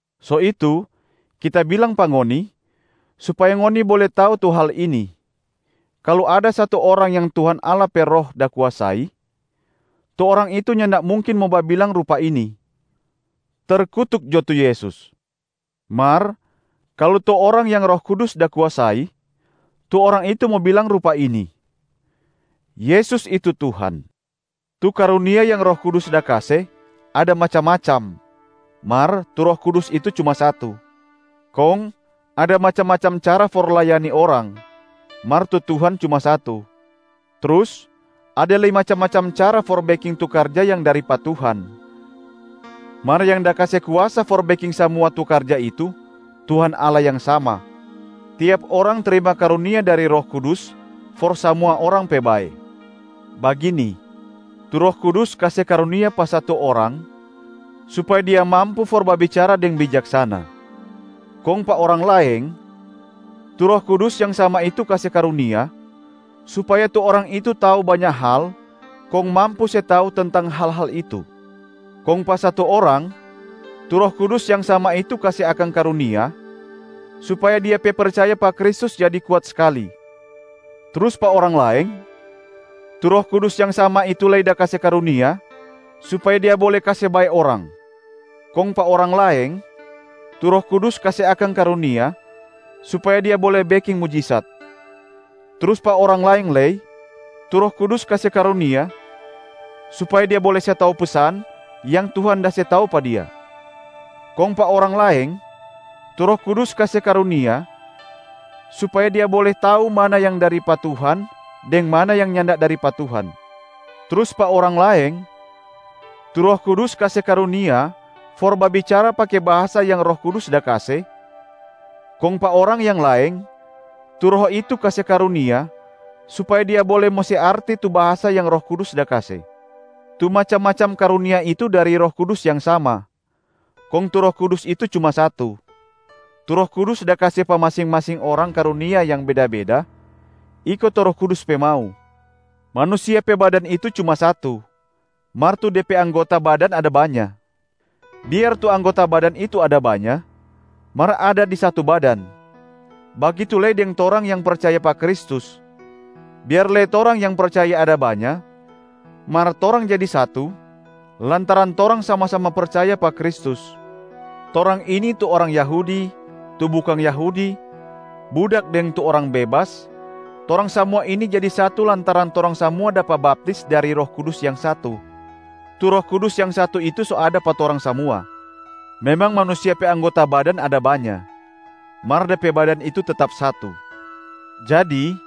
So itu kita bilang pa ngoni supaya ngoni bole tau tu hal ini, kalu ada satu orang yang Tuhan Allah pe Roh da kuasai, tu orang itu nyanda mungkin mo babilang rupa ini, “Terkutuk jo tu Yesus”. Mar kalu tu orang yang Roh Kudus da kuasai, tu orang itu mo babilang rupa ini, “Yesus itu Tuhan”. Tu karunia yang Roh Kudus da kase ada macam-macam, mar tu Roh Kudus itu cuma satu. Kong ada macam-macam cara for layani orang, mar tu Tuhan cuma satu. Trus ada lei macam-macam cara for beking tu karja yang dari pa Tuhan, mar yang da kase kuasa for beking samua tu karja itu Tuhan Allah yang sama. Tiap orang trima karunia dari Roh Kudus for samua orang pe bae. Bagini, tu Roh Kudus kase karunia pa satu orang supaya dia mampu for babicara deng bijaksana. Kong pa orang laeng, tu Roh Kudus yang sama itu kase karunia supaya tu orang itu tau banya hal kong mampu se tau tentang hal-hal itu. Kong pa satu orang, tu Roh Kudus yang sama itu kase akang karunia supaya dia pe percaya pa Kristus jadi kuat skali. Trus pa orang laeng, tu Roh Kudus yang sama itu lei da kase karunia supaya dia bole kase bae orang. Kong pa orang laeng, tu Roh Kudus kase akang karunia supaya dia bole beking mujisat. Trus pa orang laeng lei, tu Roh Kudus kase karunia supaya dia bole se tau pesan yang Tuhan da se tau pa dia. Kong pa orang laeng, tu Roh Kudus kase karunia supaya dia bole tau mana yang dari pa Tuhan deng mana yang nyanda dari pa Tuhan. Trus pa orang laeng, tu Roh Kudus kase karunia for babicara pake bahasa yang Roh Kudus da kase, kong pa orang yang laeng, tu Roh itu kase karunia supaya dia bole mo se arti tu bahasa yang Roh Kudus da kase. Tu macam-macam karunia itu dari Roh Kudus yang sama, kong tu Roh Kudus itu cuma satu. Tu Roh Kudus da kase pa masing-masing orang karunia yang beda-beda, iko tu Roh Kudus pe mau. Manusia pe badan itu cuma satu, mar tu de pe anggota badan ada banya. Biar tu anggota badan itu ada banya, mar ada di satu badan. Bagitu lei deng torang yang percaya pa Kristus, biar lei torang yang percaya ada banya, mar torang jadi satu lantaran torang sama-sama percaya pa Kristus. Torang ini, tu orang Yahudi, tu bukang Yahudi, budak deng tu orang bebas, torang samua ini jadi satu lantaran torang samua dapa baptis dari Roh Kudus yang satu. Tu Roh Kudus yang satu itu so ada pa torang samua. Memang manusia pe anggota badan ada banya, mar de pe badan itu tetap satu. Jadi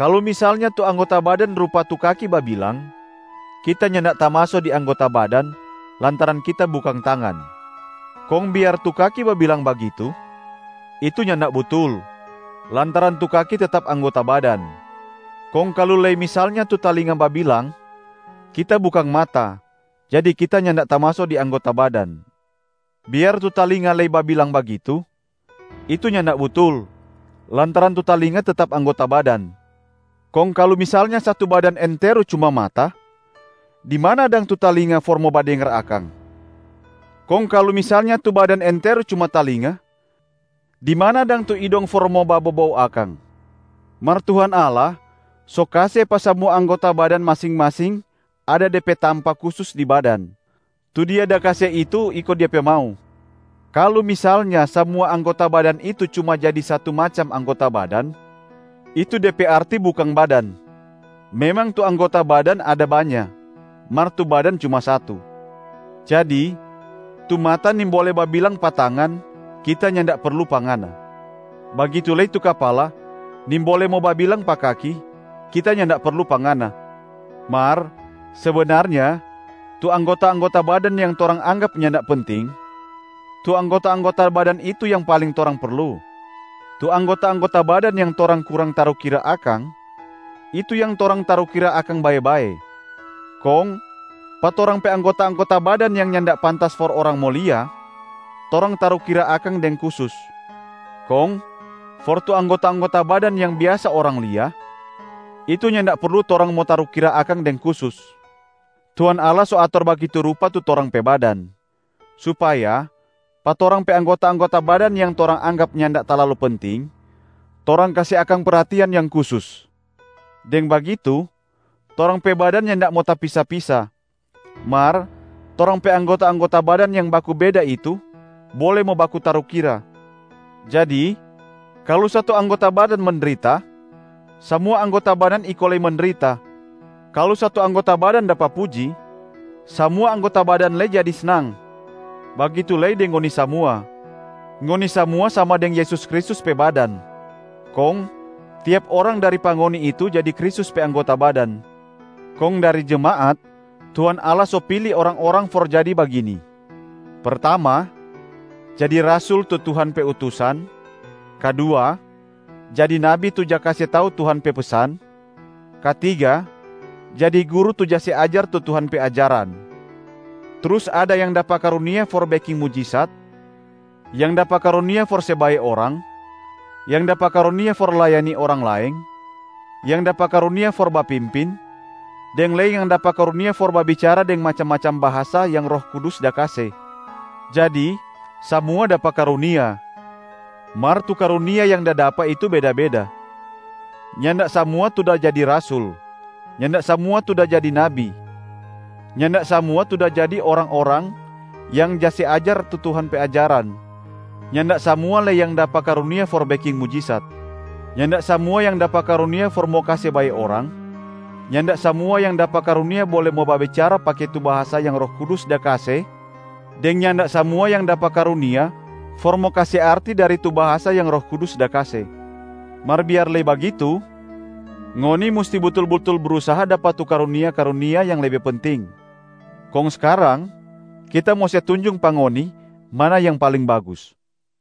kalu misalnya tu anggota badan rupa tu kaki babilang, “Kita nyanda tamaso di anggota badan, lantaran kita bukang tangan.” Kong biar tu kaki babilang bagitu, itu nyanda butul, lantaran tu kaki tetap anggota badan. Kong kalu lei misalnya tu talinga babilang, “Kita bukang mata, jadi kita nyanda tamaso di anggota badan.” Biar tu talinga lei babilang bagitu, itu nyanda butul, lantaran tu talinga tetap anggota badan. Kong kalu misalnya satu badan enteru cuma mata, di mana dang tu talinga for mo badengar akang? Kong kalu misalnya tu badan enteru cuma talinga, di mana dang tu idong for mo babobou akang? Mar Tuhan Allah so kase pa samua anggota badan masing-masing ada de pe tampa kusus di badan, tu Dia da kase itu iko Dia pe mau. Kalu misalnya samua anggota badan itu cuma jadi satu macam anggota badan, itu de pe arti bukang badan. Memang tu anggota badan ada banya, mar tu badan cuma satu. Jadi tu mata nimbole babilang pa tangan, “Kita nyanda perlu pa ngana.” Bagitu lei tu kapala nimbole mo babilang pa kaki, “Kita nyanda perlu pa ngana.” Mar sebenarnya tu anggota-anggota badan yang torang anggap nyanda penting, tu anggota-anggota badan itu yang paling torang perlu. Tu anggota-anggota badan yang torang kurang tarukira akang, itu yang torang tarukira akang bae-bae. Kong pa torang pe anggota-anggota badan yang nyanda pantas for orang mo lia, torang tarukira akang deng kusus. Kong for tu anggota-anggota badan yang biasa orang lia, itu nyanda perlu torang mo tarukira akang deng kusus. Tuhan Allah so ator bagitu rupa tu torang pe badan, supaya pa torang pe anggota-anggota badan yang torang anggap nyanda talalu penting, torang kase akang perhatian yang kusus. Deng bagitu torang pe badan nyanda mo tapisa-pisa, mar torang pe anggota-anggota badan yang baku beda itu bole mo baku tarukira. Jadi kalu satu anggota badan mendrita, samua anggota badan iko lei mendrita. Kalu satu anggota badan dapa puji, samua anggota badan lei jadi snang. Bagitu lei deng ngoni samua, ngoni samua sama deng Yesus Kristus pe badan, kong tiap orang dari pa ngoni itu jadi Kristus pe anggota badan. Kong dari jemaat, Tuhan Allah so pili orang-orang for jadi bagini: pertama, jadi rasul tu Tuhan pe utusan, kadua, jadi nabi tu ja kase tau Tuhan pe pesan, katiga, jadi guru tu ja se ajar tu Tuhan pe ajaran. Trus ada yang dapa karunia for beking mujisat, yang dapa karunia for se bae orang, yang dapa karunia for layani orang laeng, yang dapa karunia for bapimpin, deng lei yang dapa karunia for babicara deng macam-macam bahasa yang Roh Kudus da kase. Jadi samua dapa karunia mar tu karunia yang da dapa itu beda-beda, nyanda samua tu da jadi rasul, nyanda samua tu da jadi nabi, nyanda samua tu da jadi orang-orang yang ja se ajar tu Tuhan pe ajaran, nyanda samua lei yang dapa karunia for beking mujisat. Nyanda samua yang dapa karunia for mo kase bae orang, nyanda samua yang dapa karunia bole mo babicara pake tu bahasa yang Roh Kudus da kase deng nyanda samua yang dapa karunia for mo kase arti dari tu bahasa yang Roh Kudus da kase. Mar biar lei bagitu, ngoni musti butul-butul brusaha dapa tu karunia-karunia yang lebe penting. Kong skarang, kita mo se tunjung pa ngoni mana yang paling bagus.